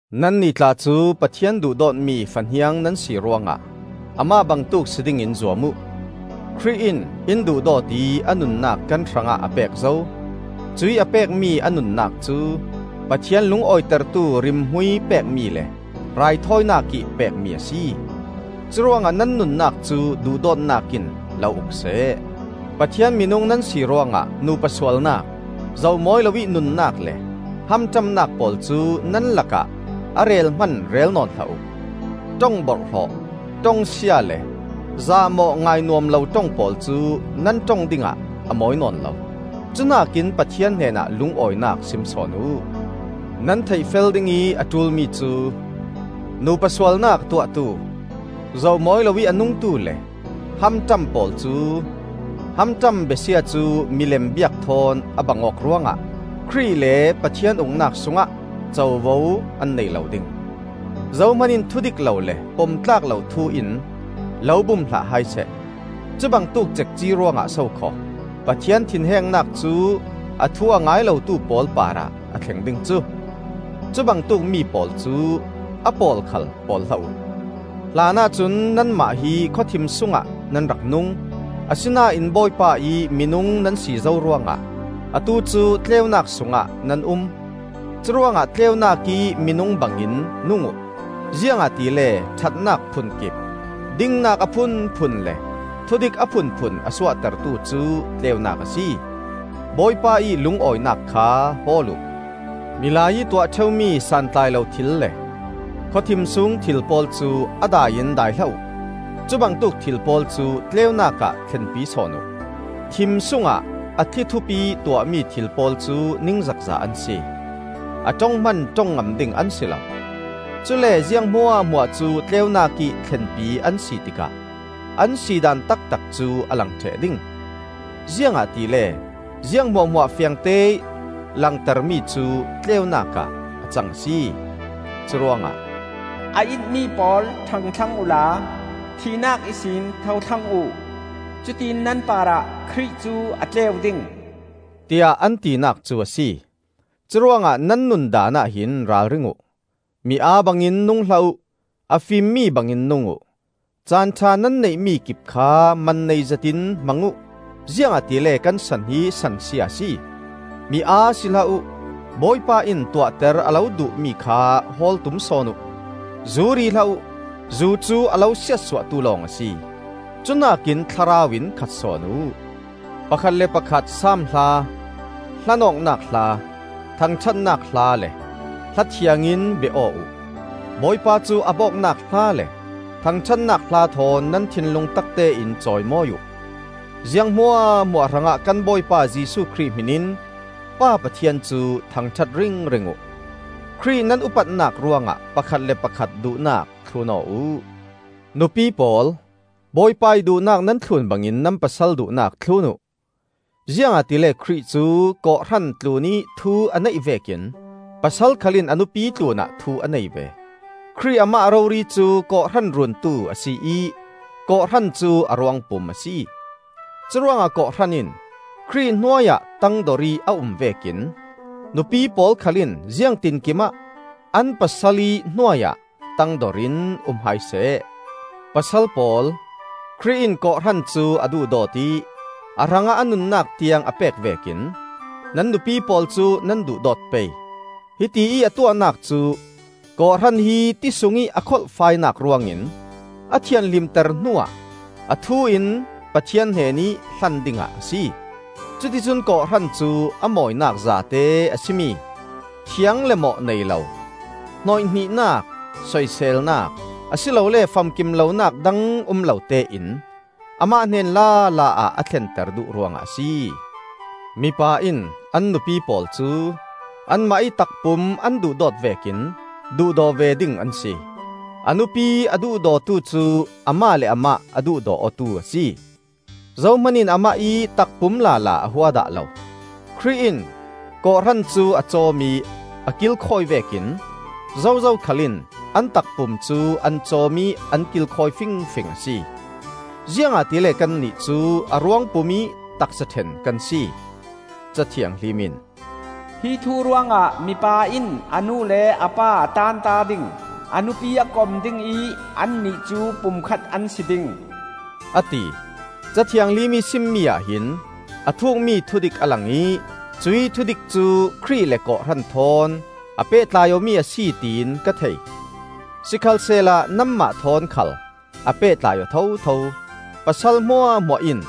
Nannih tla cu Pathian duhdawtmi fahniang nan si ruangah amah bangtuk si dingin zuam uh. Khrih in in duhdawt ih a nunnak kan hrangah a pek zo; cuih a pekmi a nunnak cu Pathian lungawitertu rimhmui pekmi le raithawinak ih pekmi a si. Curuangah nan nunnak cu duhdawtnak in lo uk seh. Pathian minung nan si ruangah nupa sualnak, zoh mawi loih nunnak le hamṭamnak pawl cu nan lakah a rel hman rel nawn hlah uh. Ṭong borhhlawh, ṭongsia le zahmawh ngainuam lo ṭong pawl cu nan ṭong dingah a mawi nawn lo. Cuhnakin Pathian hnenah lungawinak sim sawn uh. Nan theihfel dingih a ṭulmi cu: nupa sualnak a tuahtu, zoh mawi loih a nungtu le hamṭam pawl cu (hamṭam besia cu milem biak thawn a bang awk ruangah) Khrih le Pathian Uknak sungah covo an nei lo ding. Zohman in thudik lo le pom tlak lo thu in lo bum hlah hai seh. Cubangtuk cekci ruangah sokhaw Pathian thinhengnak cu a thu a ngai lotu pawl parah a thlen ding cu! Cubangtuk mi pawl cu a pawl khal pawl hlah uh. Hlanah cun nanmah hi khawthim sungah nan rak nung; asinain Bawipa ih minung nan si zo ruangah atu cu tleunak sungah nan um. Curuangah tleunak ih minung bangin nung uh. Ziangahtile ṭhatnak phunkip, dingnak a phunphun le thudik a phunphun a suahtertu cu tleunak a si. Bawipa ih lungawinak kha hawl uh. Milai ih tuah ṭheumi santlai lo thil le khawthim sung thil pawl cu a dai in dai hlah uh. Cubangtuk thil pawl cu tleunak ah thlenpi sawn uh. Thim sungah a thlithup ih tuahmi thil pawl cu ningzakza an si; a ṭong hman ṭong ngam ding an si lo. Cule ziang hmuahhmuah cu tleunak ih thlenpi an si tikah an si daan taktak cu a lang ṭheh ding. Ziangahtile ziang hmuahhmuah fiangteih langtermi cu tleunak ah a cang a si. Curuangah, “A itmi pawl, ṭhang thlang uhla, thihnak ihsin tho thlang uh. Cutiin nan parah Khrih cu a tleu ding,” tiah an tinak cu a si. Curuangah nan nundaanah hin ralring uh. Mi aa bangin nung hlah uh; a fimmi bangin nung uh. Caan ṭha nan neih-mi kip kha man nei zetin hmang uh; ziangahtile kan san hi sansia a si. Mi aa si hlah uh; Bawipa in tuahter a lo duhmi kha hawl tum sawn uh. Zu ri hlah uh; zu cu a lo siatsuahtu lawng a si. Cuhnakin Thlarau in khat sawn uh. Pakhat le pakhat Saam Hla, hlan awknak hla, thangṭhatnak hla, le hla thiang in bia aw uh. Bawipa cu ap awknak hla le thangṭhatnak hla thawn nan thinlung taktein cawimawi uh. Ziang hmuahhmuah hrangah kan Bawipa Jesuh Khrih hminin Pa Pathian cu thangṭhat ringring uh. Khrih nan upatnak ruangah pakhat le pakhat duhnak thlun aw uh. Nupi pawl, Bawipa ih duhnak nan thlun bangin nan pasal duhnak thlun uh. Ziangahtile Khrih cu kawhhran tlunih thu a neih vekin pasal khal in a nupi tlunah thu a nei ve. Khrih amah rori cu kawhhran Runtu a si ih kawhhran cu a ruangpum a si. Curuangah kawhhran in Khrih hnuai ah tangdor ih a um vekin nupi pawl khal in ziangtinkim ah an pasal ih hnuai-ah tangdorin um hai seh. Pasal pawl, Khrih in kawhhran cu a duhdawt ih a hrangah a nunnak tiang a pek vekin nan nupi pawl cu nan duhdawt pei. Hitiih a tuahnak cu kawhhran hi ti sungih a kholhfainak ruangin a thianhlimter hnuah a thu in Pathian hnenih hlan dingah a si. Cuticun kawhhran cu a mawinak zate a si mi: thiang le mawh nei lo, hnawihnihnak, soiselnak, a si lole famkim lonak dang um lo tein amah hnen lala ah a thlenter duh ruangah a si. Mipa in an nupi pawl cu anmah ih takpum an duhdawt vekin duhdaw ve ding an si. A nupi a duhdawtu cu amah le amah a duhdaw awtu a si. Zohman in amah ih takpum lala a hua dah lo. Khrih in kawhhran cu a cawm ih a kilkhawi vekin zozo khal in an takpum cu an cawm ih an kilkhawi fingfing a si. Ziangahtile kannih cu a ruangpum ih taksa ṭhen kan si. Ca Thianghlim in, “Hi thu ruangah mipa in a nu le a pa a taanta ding, a nupi a kom ding ih annih cu pumkhat an si ding,” a ti. Ca Thianghlimih simmi ah hin a thukmi thudik a lang ih cuih thudik cu Khrih le kawhhran thawn a pehtlai awmi a si, tiin ka thei. Sikhalsehla nanmah thawn khal a pehtlai aw thotho; pasal hmuahhmuah in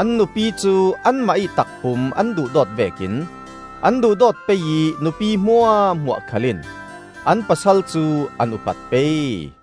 an nupi cu anmah ih takpum an duhdawt vekin an duhdawt pei ih nupi hmuahhmuah khal in an pasal cu an upat pei.